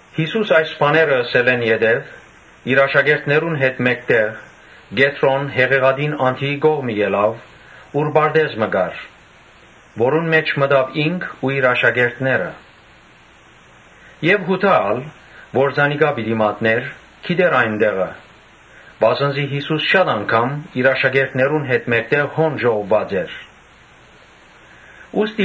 Յիսուս այս բաները ըսելէն յետոյ, իր աշակերտներուն հետ մէկտեղ Կեդրոն հեղեղատին անդիի կողմը գնաց, ուր պարտէզ մը կար, որուն մէջ մտան ինք ու իր աշակերտները։ Յուդա, որ զանիկա պիտի մատնէր, գիտէր այն տեղը, վասն զի Յիսուս շատ անգամ իր աշակերտներուն հետ հոն կը հաւաքուէին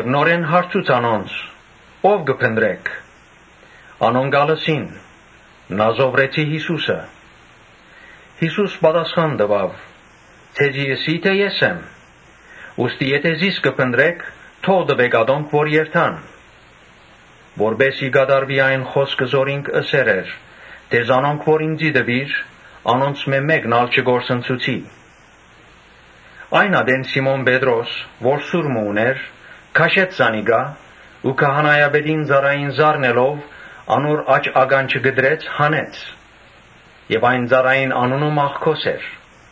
Նորէն հարցուց անոնց. «Ո՞վ կը փնտռէք»։ Անոնք ալ ըսին. «Նազովրեցի Յիսուսը»։ Յիսուս պատասխան տուաւ. «Ձեզի ըսի թէ Ե՛ս եմ. ուստի եթէ զիս կը փնտռէք, թող տուէք ատոնք որ երթան»։ Անով կատարուեցաւ այն խօսքը, որ ինք ըսեր էր թէ՝ «Զանոնք որ ինծի տուիր, անոնցմէ մէ՛կն ալ չկորսնցուցի»։ Այն ատեն Սիմոն Պետրոս, որ սուր մը ունէր, քաշեց զանիկա ու քահանայապետին ծառային զարնելով՝ անոր աջ ականջը կտրեց։ Այն ծառային անունը Մաղքոս էր։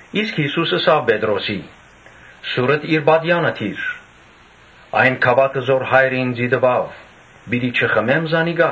Յիսուս ըսաւ Պետրոսին. «Սուրդ իր պատեա՛նը դիր. այն գաւաթը որ Հայրը ինծի տուաւ՝ պիտի չխմե՞մ»։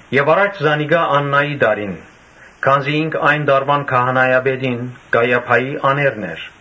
Եւ առաջ Աննային տարին, քանզի ինք այն տարուան քահանայապետին՝ Կայիափային՝ աներն էր։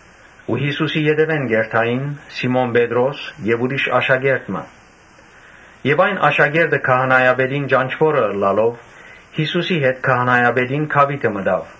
Յիսուսին ետեւէն կ’երթային Սիմոն Պետրոս եւ ուրիշ աշակերտ մը։ Այն աշակերտը քահանայապետին ծանօթ ըլլալով՝ Յիսուսին հետ քահանայապետին գաւիթը մտաւ։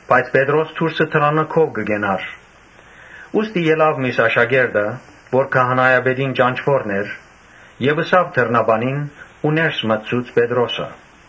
Բայց Պետրոս դուրսը գաւիթը կը կենար. ուստի եկաւ միւս աշակերտը, որ քահանայապետին ծանօթն էր եւ խօսեցաւ դռնապանին հետ ու ներս մտցուց Պետրոսը։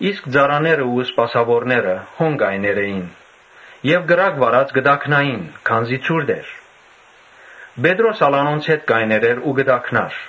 Իսկ ծառաներն ու սպասաւորները հոն կայներ էին եւ կրակ վառած կը տաքնային, քանզի ցուրտ էր։ Պետրոս ալ անոնց հետ կայներ էր ու կը տաքնար։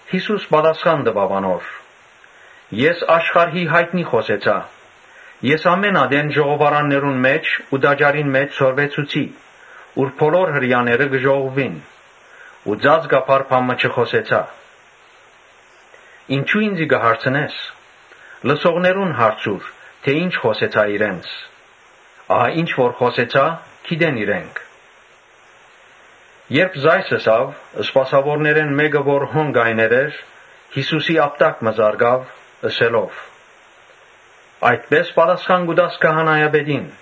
Յիսուս պատասխան տուաւ անոր. «Ես աշխարհին յայտնի խօսեցայ. ես ամէն ատեն ժողովարաններուն մէջ ու տաճարին մէջ սորվեցուցի, ուր բոլոր Հրեաները կը հաւաքուէին ու ծածուկ բան մը չխօսեցայ։ Ինչո՞ւ ինծի կը հարցնես, լսողներուն հարցուր թէ ի՞նչ խօսեցայ իրենց. ահա ինչ որ խօսեցայ՝ գիտեն իրենք»։ Երբ ասիկա ըսաւ, սպասաւորներէն մէկը, որ հոն կայներ էր, Յիսուսին ապտակ մը զարկաւ՝ ըսելով. «Այդպէ՞ս պատասխան կու տաս քահանայապետին»։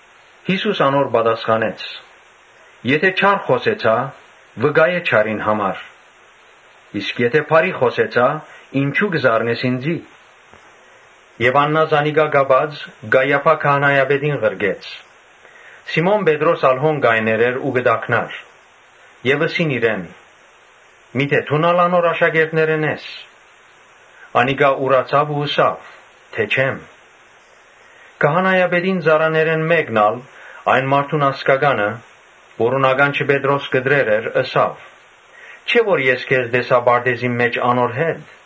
Յիսուս անոր պատասխանեց. «Եթէ սխալ խօսեցայ, վկայէ սխալին համար. իսկ եթէ ճիշդ խօսեցայ, ինչո՞ւ կը զարնես ինծի»։ Աննան զանիկա կապած՝ Կայիափա քահանայապետին ղրկեց։ Սիմոն Պետրոս ալ հոն կայներ էր ու կը տաքնար եւ ըսին իրեն. «Միթէ դո՞ւն ալ անոր աշակերտներէն ես»։ Անիկա ուրացաւ ու ըսաւ թէ «Չեմ»։ Քահանայապետին ծառաներէն մէկն ալ, այն մարդուն ազգականը, որուն ականջը Պետրոս կտրեր էր, ըսաւ. «Չէ՞ որ ես քեզ տեսայ պարտէզին մէջ անոր հետ»։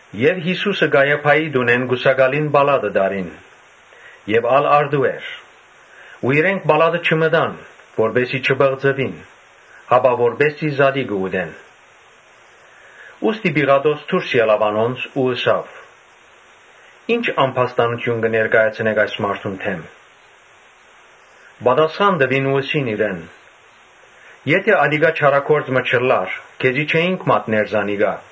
Յիսուսը Կայիափային տունէն կուսակալին պալատը տարին։ Ալ առտու էր։ Իրենք պալատը չմտան, որպէս զի չպղծուին, հապա որպէս զի զատիկը ուտեն։ Ուստի Պիղատոս դուրս ելաւ անոնց ու ըսաւ. «Ի՞նչ ամբաստանութիւն կը ներկայացնէք այս մարդուն դէմ»։ Պատասխան տուին ու ըսին իրեն. «Եթէ ատիկա չարագործ մը չըլլար, քեզի չէինք մատներ զանիկա»։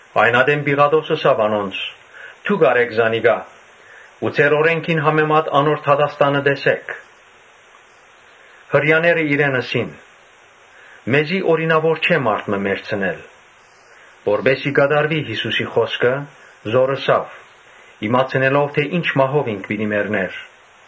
Այն ատեն Պիղատոս ըսաւ անոնց. «Դուք առէք զանիկա ու ձեր օրէնքին համեմատ անոր դատաստանը տեսէք»։ Հրեաները իրեն ըսին. «Մեզի օրինաւոր չէ մարդ մը մեռցնել»։ Որպէս զի կատարուի Յիսուսին խօսքը, որ ըսաւ՝ իմացնելով թէ ի՛նչ մահով ինք պիտի մեռնէր։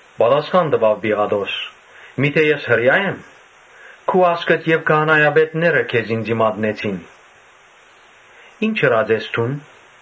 Պատասխան տուաւ Պիղատոս. «Միթէ ես Հրեա՞յ եմ. քու ազգդ եւ քահանայապետները քեզ ինծի մատնեցին. ի՞նչ ըրած ես դուն»։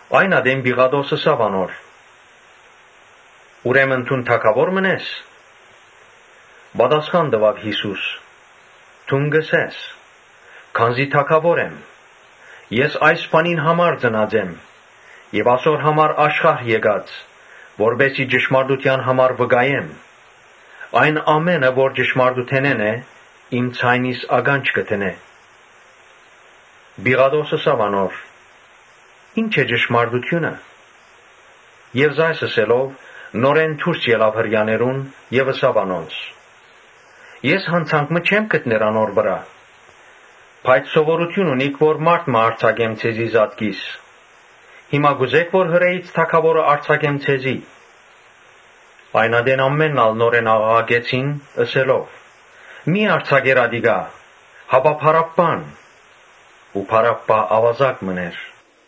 Այն ատեն Պիղատոս ըսաւ անոր. «Ուրեմն դուն թագաւո՞ր մըն ես»։ Պատասխան տուաւ Յիսուս. «Դուն կ’ըսես, քանզի թագաւոր եմ։ Ես այս բանին համար ծնած եմ եւ ասոր համար աշխարհ եկած, որպէս զի ճշմարտութեան համար վկայեմ։ Ամէն մարդ որ ճշմարտութենէն է՝ իմ ձայնիս ականջ կը դնէ»։ Պիղատոս ըսաւ անոր. «Ի՞նչ է ճշմարտութիւնը»։ Ասիկա ըսելով՝ նորէն դուրս ելաւ Հրեաներուն եւ ըսաւ անոնց. «Ես յանցանք մը չեմ գտներ անոր վրայ։ Բայց սովորութիւն ունիք որ մարդ մը արձակեմ ձեզի զատկին։ Հիմա կ’ուզէ՞ք որ Հրէից թագաւորը արձակեմ ձեզի»։ Այն ատեն ամէնքն ալ նորէն աղաղակեցին՝ ըսելով. «Մի՛ արձակեր ատիկա, հապա Բարաբբան»։ Բարաբբա աւազակ մըն էր։